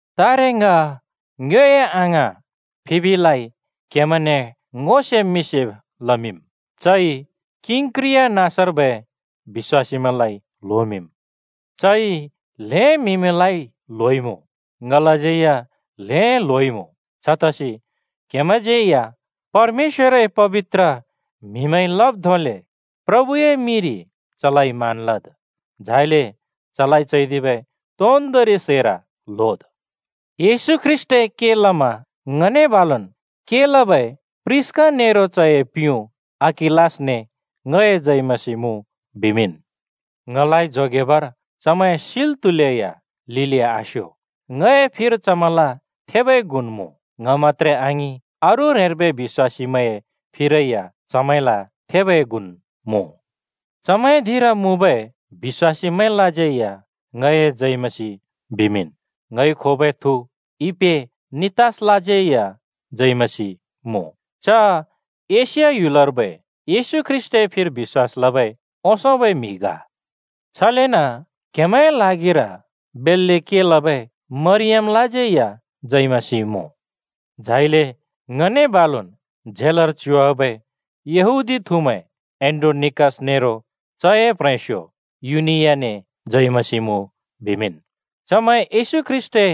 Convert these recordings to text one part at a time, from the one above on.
तारे ङ ङ्योए अङाँ फिबिलाइ क्‍हेमैंने ङो सेब् मिं सेब् लमिंम्। चइ किंक्रिया नाँसर्बै बिश्‍वासीमैंलाइ ल्होमिंम्। चइ ल्हें म्हिलाइ ल्होइमुँ, ङलाज्यै या ल्हें ल्होइमुँ। छतसि क्‍हेमैंज्‍यै परमेश्‍वरए पबित्र म्हिमैंइ लब् धोंले प्रभुए मिंरि चलाइ मान लद्, झाइले चलाइ चैदिबै तोन्दोंरि सैर ल्होद्। येशू ख्रीष्‍टए के लमा ङने बालुन् के लबै प्रिस्‍का नेरो चए प्युँ अकिलासने ङए जय मसीह मुँ बिमिंन्। ङलाइ जोगेबर चमैं सिल् त्हुलेया लिलि आस्यो ङए फिर चमैंल थेबै गुन् मुँ। ङ मत्‍त्रे आङिं, अरू ह्रेंर्बै बिश्‍वासमैंए फिरै या चमैंल थेबै गुन् मुँ। चमैंए धिंर मुँबै बिश्‍वासीमैंलाज्यै या ङए जय मसीह बिमिंन्। ङइ खोबै थु इपेनितसलाज्यै या जय मसीह मुँ। च एशिया ह्‍युलर्बै येशू ख्रीष्‍टए फिर बिश्‍वास लबै ओंसोंबै म्‍हि ग। छलेन क्‍हेमैंए ल्हागिर बेल्‍ले के लबै मरियमलाज्यै या जय मसीह मुँ। झाइले ङने बालुन् झेलर च्युवाबै यहूदी थुमैं एन्‍ड्रोनिकस नेरो चए प्ह्रेंस्यो युनियाने जय मसीह मुँ बिमिंन्। चमैं येशू ख्रीष्‍टए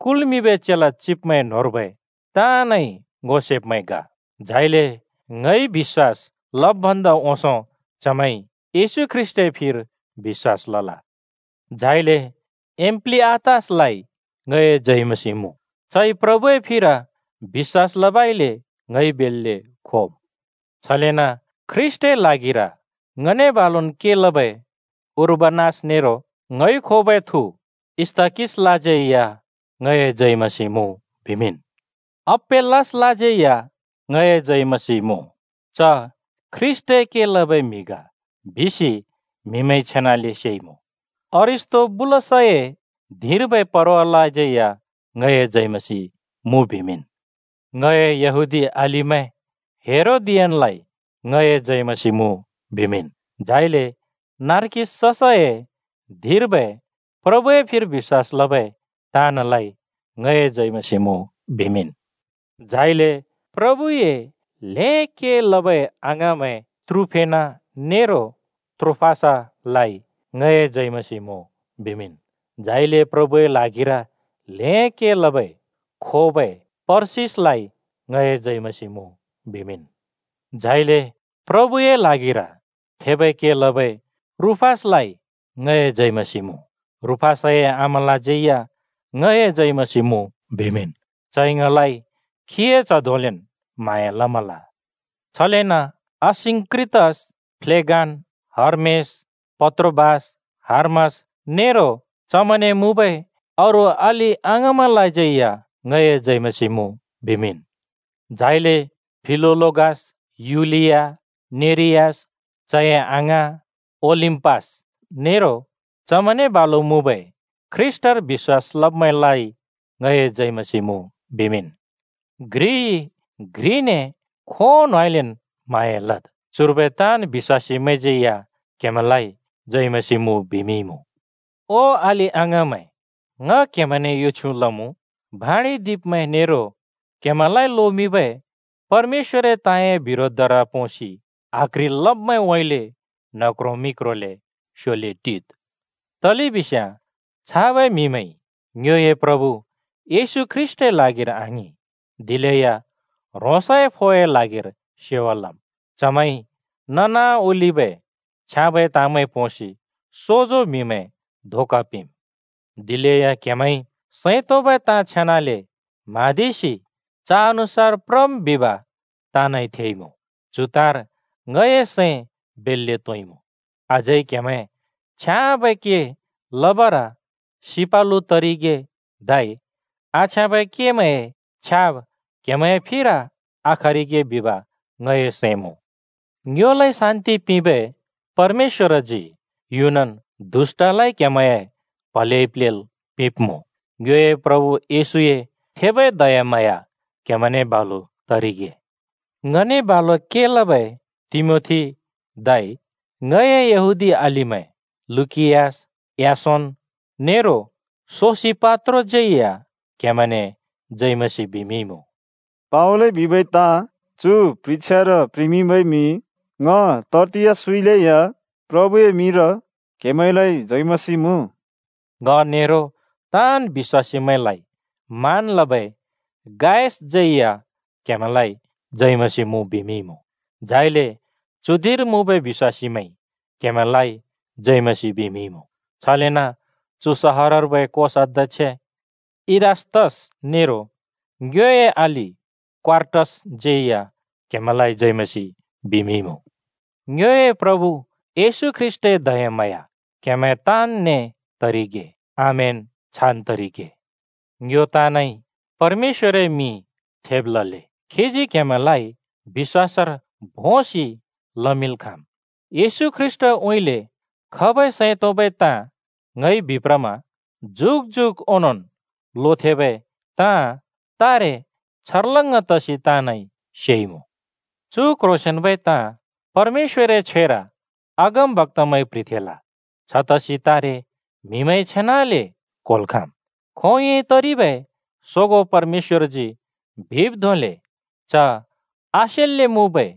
कुल्मिंबै चेला चिब्मैं न्होंर्बै ताँनइ ङो सेब्मैं ग। झाइले ङइ बिश्‍वास लब् भन्दा ओंसों चमैंइ येशू ख्रीष्‍टए फिर बिश्‍वास लल। झाइले एम्प्लिआतसलाइ ङए जय मसीह मुँ। चइ प्रभुए फिर बिश्‍वास लबइले ङइ बेल्‍ले खोम्। छलेन ख्रीष्‍टए ल्हागिर ङने बालुन् के लबै उर्बानस नेरो ङइ खोबै थु स्‍ताकिसलाज्यै या ङए जय मसीह मुँ बिमिंन्। अपेल्‍लेसलाज्यै या ङए जय मसीह मुँ। च ख्रीष्‍टए के लबै म्‍हि ग बिसि म्‍हिमैंइ छेनाले सेइमुँ। अरिस्‍तोबुलसए धिंर्बै परवालाज्यै ङए जय मसीह मुँ बिमिंन्। ङए यहूदी अलिमैं हेरोदियनलाइ ङए जय मसीह मुँ बिमिंन्। झाइले नर्किससए धिंर्बै प्रभुए फिर बिश्‍वास लबै ताँनलाइ ङए जय मसीह मुँ बिमिंन्। झाइले प्रभुए के बेल्‍ले लबै अङाँमैं त्रुफेना नेरो त्रोफोसालाइ ङए जय मसीह मुँ बिमिंन्। झाइले प्रभुए ल्हागिर ल्हें के लबै खोबै परसिसलाइ ङए जय मसीह मुँ बिमिंन्। झाइले प्रभुए ल्हागिर थेबै के लबै रूफसलाइ ङए जय मसीह मुँ। रूफसए आमालाज्यै या ङए जय मसीह मुँ बिमिंन्। चइ ङलाइ खीए च्‍ह धोंलेन् म्हाँया लमल। छलेन असिंक्रितस, फ्लेगन, हर्मेस, पत्रोबास, हर्मास नेरो चमैंने मुँबै अरू अलि-अङाँमैंलाज्यै या ङए जय मसीह मुँ बिमिंन्। झाइले फिलोलोगस, युलिया, नेरियस, चए अङाँ, ओलिम्‍पास नेरो चमैंने बालु मुँबै ख्रीष्‍टर बिश्‍वास लब्‍मैंलाइ ङए जय मसीह मुँ बिमिंन्। घ्रिइ घ्रिने खोंउँइँलेन् म्हाँया लद्। चुर्बै ताँन् बिश्‍वासीमैंज्यै या क्‍हेमैंलाइ जय मसीह बिमिंइमुँ। ओ अलि-अङाँमैं, ङ क्‍हेमैंने यो छ्युँ लमुँ, भाँडिदिब्‍मैं नेरो क्हेमैंलाइ लोमिंबै परमेश्‍वरए ताँए बिरोधर पोंसि आक्ह्रिल् लब्‍मैंउँइँले न्ह क्रों मि क्रोंले स्‍योले टिद्। तलेबिस्याँ छाबै म्‍हिमैंइ ङ्योए प्रभु येशू ख्रीष्‍टए ल्हागिर आङिं, दिलेया ह्रोंसए फोए ल्हागिर सेवा लम्। चमैंइ ननाओलिबै छ्याँबै ताँमैं पोंसि सोजो म्‍हिमैं धोका पिंम्। दिलेया क्‍हेमैंइ सैं तोंबै ताँ छेनाले म्हाँदिसि च अनुसार प्रम् बिब ताँनइ थेइमुँ। चु ताँर ङए सैं बेल्‍ले तोंइमुँ। अझै क्‍हेमैं छ्याँबै के लबर सिपालु तरिगे, धै आछ्याँबै केमैंए छ्याब क्हेमैंए फिर आखरिगे बिब ङए सैं मुँ। ङ्योलाइ शान्‍ति पिंबै परमेश्‍वरजी युनन् दुष्‍टलाइ क्‍हेमैंए प्‍हलेइ प्‍लेल् पिंब्‍मुँ। ङ्योए प्रभु येशूए थेबै दयाम्हाँया क्‍हेमैंने बालु तरिगे। ङने बालु के लबै तिमोथी, धै ङए यहूदी अलिमैं लुकियस, यासोन नेरो सोसिपात्रोज्‍यै या क्‍हेमैंने जय मसीह बिमिंइमुँ। (पावलइ बिबै ताँ चु प्ह्रिछ्यार प्‍ह्रिमिंबै म्‍हि ङ तर्तियसउँइँले या प्रभुए मिंर क्‍हेमैंलाइ जय मसीह मुँ।) ङ नेरो ताँन् बिश्‍वासीमैंलाइ मान लबै गायसज्यै या क्‍हेमैंलाइ जय मसीह मुँ बिमिंइमुँ। झाइले चु धिंर मुँबै बिश्‍वासीमैंइ क्‍हेमैंलाइ जय मसीह बिमिंइमुँ। छलेन चु सहरर्बै कोशाध्‍यक्ष इरास्‍तस नेरो ङ्योए अलि क्‍वार्टसज्‍यै या क्‍हेमैंलाइ जय मसीह बिमिंइमुँ। ङ्योए प्रभु येशू ख्रीष्‍टए दयाम्हाँया क्‍हेमैं ताँनने तरिगे। आमेन। छान् तरिगे। ङ्यो ताँनइ परमेश्‍वरए मिं थेब लले! खीजी क्‍हेमैंलाइ बिश्‍वासर भोंसि लमिंल् खाँम्। येशू ख्रीष्‍टउँइँले खबै सैं तोंबै ताँ ङइ बिप्रमा जुग जुग ओनोंन् लोथेंबै ताँ तारे छर्लङ्ग तसि ताँनइ सेइमुँ। चु क्ह्रोंसेंन्बै ताँ परमेश्‍वरए छ्वेर अगमबक्‍तामैंइ प्‍ह्रिथेंल छतसि तारे म्‍हिमैंइ छेनाले क्‍होल् खाँम्। खोंयोंइ तरिबै सोगों परमेश्‍वरजी बिब् धोंले च आसेल्‍ले मुँबै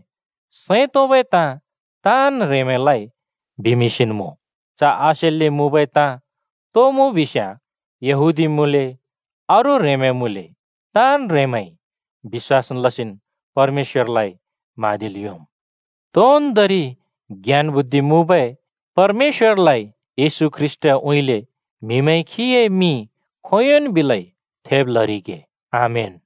सैं तोंबै ताँ ताँन् ह्रेंमैंलाइ बिमिंसिन् मुँ। च आसेल्‍ले मुँबै ताँ तो मुँ बिस्‍याँ यहूदी मुँले अरू ह्रें मुँले ताँन् ह्रेंमैंइ बिश्‍वास लसिन् परमेश्‍वरलाइ म्हाँदिल् योंम्। तोन्दोंरि ज्ञान-बुद्धि मुँबै परमेश्‍वरलाइ येशू ख्रीष्‍टउँइँले म्‍हिमैंइ खीए मिं खोंयोंन् बिलै थेब लरिगे। आमेन।